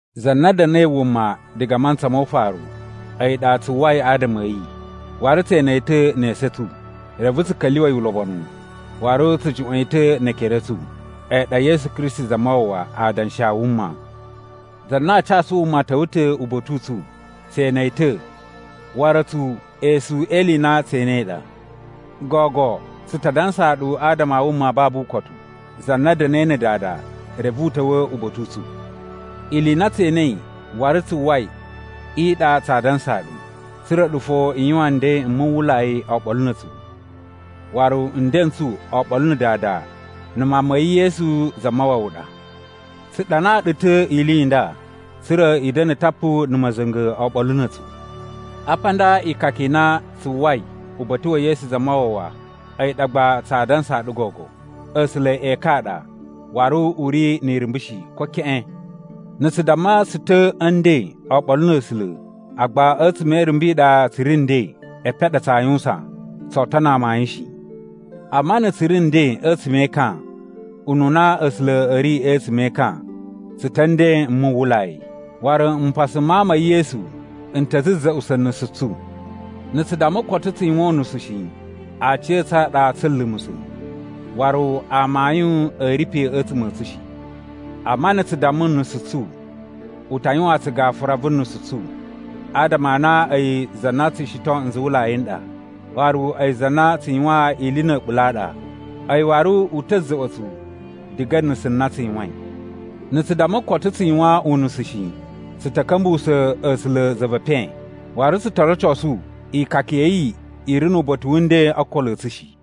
Za na da̱na̱i wuma diga a mantsa mo ufaru, a̱yi ɗa tsu uwwai adama a̱ yi, waru tse ene yi ta̱ ne esu a̱ tsu, reve tsu ka̱lyuwa̱ yi ulobonu, waru tsu juꞌwa̱n yi ta̱ ne ekere a̱ tsu. A̱yi ɗa Yesu Kristi Zamawawa, Adanshi a wuma. Za na a casu wuma ta̱wa̱ ta̱ uba̱ta̱ u tsu! Tse ene yi ta̱, waru a̱tsu esu e ili i na tse enei ɗa. Gogo tsu ta dansaa ɗu adama a wuma a babu ukotu za na da̱na̱i na̱ Dada reve u ta̱wa̱ uba̱ta̱ u tsu. Ili i na tse enei waru tsu uwwai i ɗa tsaa dansaa ɗu, tsa̱ra̱ a̱ɗu fo i yuwan nden m muwwulai oɓolo na̱ a̱tsu. Waru nden n tsu oɓolo na̱ Dada na̱ Mawun ma̱ yi Yesu Zamawawa ɗa. Tsu ɗanaa ɗu ta̱ ili i nda tsa̱ra̱ i da̱na̱ tapu na̱ ma̱za̱nga̱ oɓolo na̱ a̱tsu. Apa a nda ikaka i na tsu uwwai uba̱ta̱ wa̱ Yesu Zamawawa a̱yi ɗa gba tsaa dansaa ɗu gogo: A̱sula̱ ekan a ɗa, waru u ri ni irumbu shi, ko keꞌen. Na̱ tsu damma tsu ta̱ a̱ nden oɓolo na̱ A̱sula̱, agba a̱tsuma̱ e irumbu i ɗa tsu ri nden, epen a ɗa tsaa yuwusan, tsoo tono amayun shi. Amma na̱ tsu ri nden a̱tsuma̱ e ekan, ununa A̱sula̱ a̱ ri a̱tsuma̱ e ekan, tsu ta̱ a̱ nden m muwwulai. Waru mpasa m Mawun ma̱ yi Yesu n ta̱ za̱za̱ꞌusa̱ nusu tsu. Na̱ tsu damma koto tsu yuwan unusu shi, aciya̱tsu a ɗa tsa̱a̱ lumusa̱, waru amayun a̱ ri pe a̱tsuma̱ a̱ tsu shi. Amma na̱ tsu damma nusu tsu, u ta yuwaan tsu gafura vu nusu tsu adama a na a̱yi za na tsu shiton nzuwulai n ɗa, waru a̱yi za na tsu yuwan ili na̱ a̱ɓula̱ a ɗa. A̱yi waru u ta̱ za̱ꞌwa̱ tsu diga a̱ nusu na tsu yuwain. Na̱ tsu damma koto tsu yuwan unusu shi, tsu ta̱ ka̱mbuwusa̱ A̱sula̱ za ve epen, waru tsu to rocosu ikaka ya̱ yi i ri nu uba̱ta̱ wu nden o okolo a̱ tsu shi.